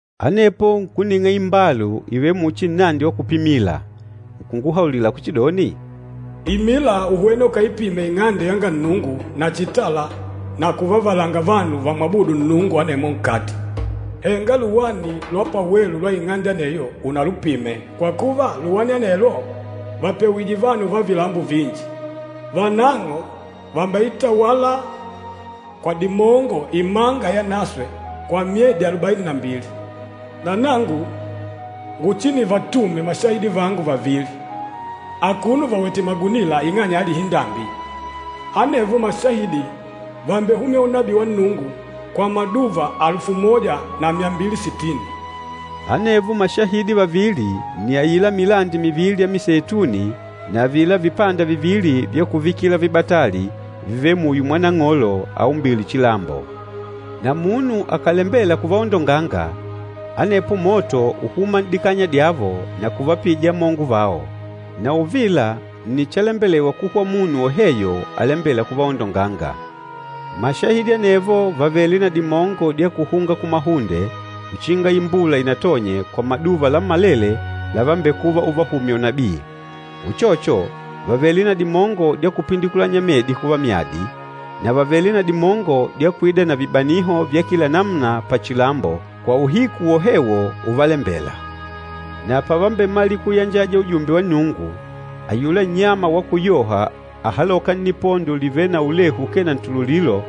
Anepo nkuning'a imbalu ivêle muchi nnandi wa kupimila, nkunguhaulila kuchidoni, “Imila uhwene ukaipime Ing'ande yanga Nnungu na chitala na kuvavalanga vanu vamwabûdu Nnungu anemwo nkati. Henga luwani lwa pawelu lwa ing'ande aneyo unalupime, kwa kuva luwani anelwo vàpewije vanu va vilambo vinji. Vanang'o vàmbeitawala kwa dimongo imanga yanaswe kwa myedi alubaini na mbili. Na nangu nguchinivatume mashahidi vangu vavili, akuno vawètè magunila ing'anya ya lihindambi. Anevo mashahidi vàmbehumya unabii wa Nnungu kwa maduva alufu moja na myambili sitini.” Anevo mashahidi vavili nni aila milandi mivili ya miseituni na avila vipanda vivili vya kuvikila vibatali vivêle muyo mwa Nang'olo aumbîle chilambo. Na munu akàlembela kuvaondonganga, anepo moto ùhuma n'dikanya dyavo na kuvapija amongo vao. Na uvila nni chalembelewa kuhwa munu woheyo alembêla kuvaondonganga. Mashahidi anevo vàvele na dimongo dya kuhunga kumahunde uchinga imbula inatonye kwa maduva lammalele lavambekuva uvahumya unabii. Uchocho, vàvele na dimongo dya kupindikulanya medi kuva myadi, na vàvele na dimongo dya kuida na vibaniho vya kila namuna pachilambo kwa uhiku wohewo uvalembela. Na pavambemalila kuyanjaja ujumbe wa Nnungu, ayula nnyama wa kuyoha ahalôka nnipondo livêle na ulehu ukee na ntululilo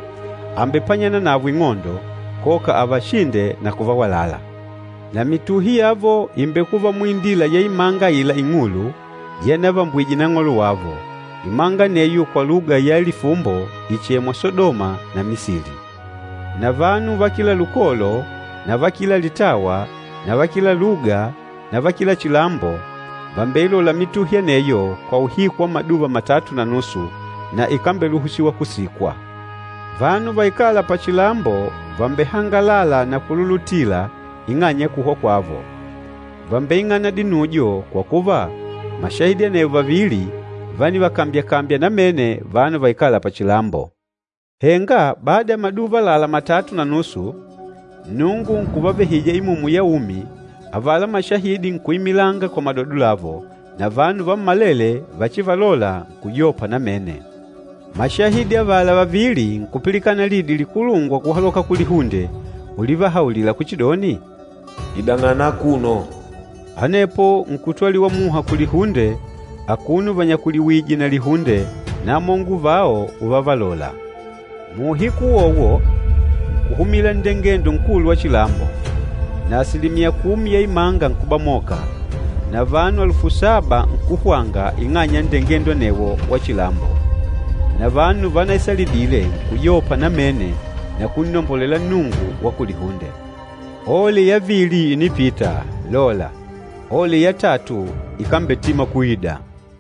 àmbepanyana navo ing'ondo, koka avashinde na kuvawalala. Na mituhi yavo ìmbekuva muindila ya imanga aila ing'ulu, yanavambwije Nang'olo wavo. Imanga aneyo kwa luga ya lifumbo ìchemwa Sadoma na Misili. Na vanu va kila lukolo na va kila litawa na va kila luga na va kila chilambo, vàmbeilola mituhi aneyo kwa uhiku wa maduva matatu na nusu, na ikambeluhusiwa kusikwa. Vanu vaikâla pachilambo vàmbehangalala na kululutila ing'anya ya kuhwa kwavo. Vàmbeing'ana dinujo, kwa kuva, mashahidi anevo vavili vánivakambyakambya namene vanu vaikâla pachilambo. Henga bada ya maduva àlalá matatu na nusu, Nnungu nkuvavehija imumu ya umi, avala mashahidi nkuimilanga kwa madodo lavo, na vanu vammalele vachivalola nkuyopa namene. Mashahidi avala vavili nkupilikana lidi likulungwa kuhaloka kulihunde ulivahaulila kuchidoni, “Idang'ana akuno!” Anepo nkutwaliwa muha kulihunde akuno vanyakuliwìjè na lihunde, na amongo vao uvavalola. Muuhiku uwowo, nkuhumila nndengendo nkulu wa chilambo, na asilimiya kumi ya imanga nkubamoka, na vanu alufu saba nkuhwanga ing'anya ya nndengendo anewo wa chilambo. Na vanu vanaisalidile nkuyopa namene na kunnombolela Nnungu wa kulihunde. Ole yavili ìnipita, lola, ole yatatu ikambetima kuida!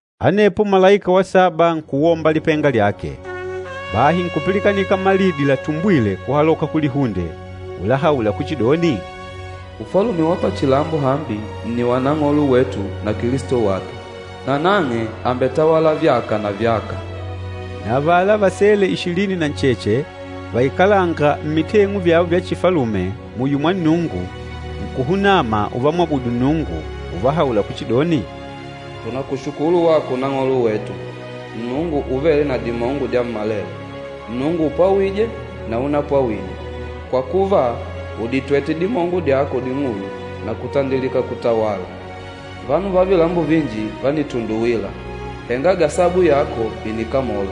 Anepo malaika wa saba nkuwomba lipenga lyake. Bahi nkupilikanika malidi latumbwile kuhaloka kulihunde, ulahaula kuchidoni, “Ufalume wa pachilambo hambi nni wa Nang'olo wetu na Kilisto wake. Nanang'e àmbetawala vyaka na vyaka!” Na avala vasele ishilini na ncheche vaikalânga mmiteng'u vyavo vya chifalume muyo mwa Nnungu, nkuhunama uvamwabudu Nnungu, uvahaula kuchidoni, “Tùnakushukulu wako Nang'olo wetu, Nnungu Uvêle na Dimongo Dyammalele, Nnungu upwawîje na unapwawije, kwa kuva, ùditwete dimongo dyako ding'ulu, na kutandilika kutawala. Vanu va vilambo vinji vánitunduwila, henga gasabu yako ìnikamola.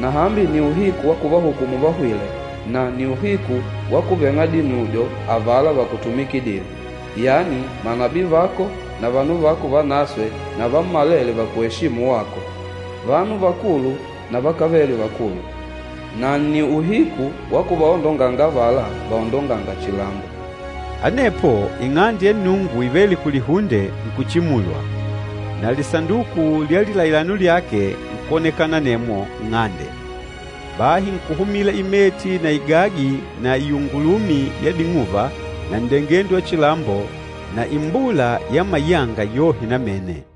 Na hambi nni uhiku wa kuvahukumu vahwîle, na nni uhiku wa kuveng'a dinujo avala vakutumikidîle, yani manabii vako na vanu vako vanaswe na vammalele vakueshîmu wako, vanu vakulu na vakávele vakulu. Na nni uhiku wa kuvaondonganga avala vaondongânga chilambo!” Anepo Ing'ande ya Nnungu ivêle kulihunde nkuchimulwa, na Lisanduku lya Lilailano lyake nkwonekana anemwo nng'ande. Bahi nkuhumila imeti na igagi na iungulumi ya ding'uva na nndengendo wa chilambo na imbula ya mayanga yohe namene.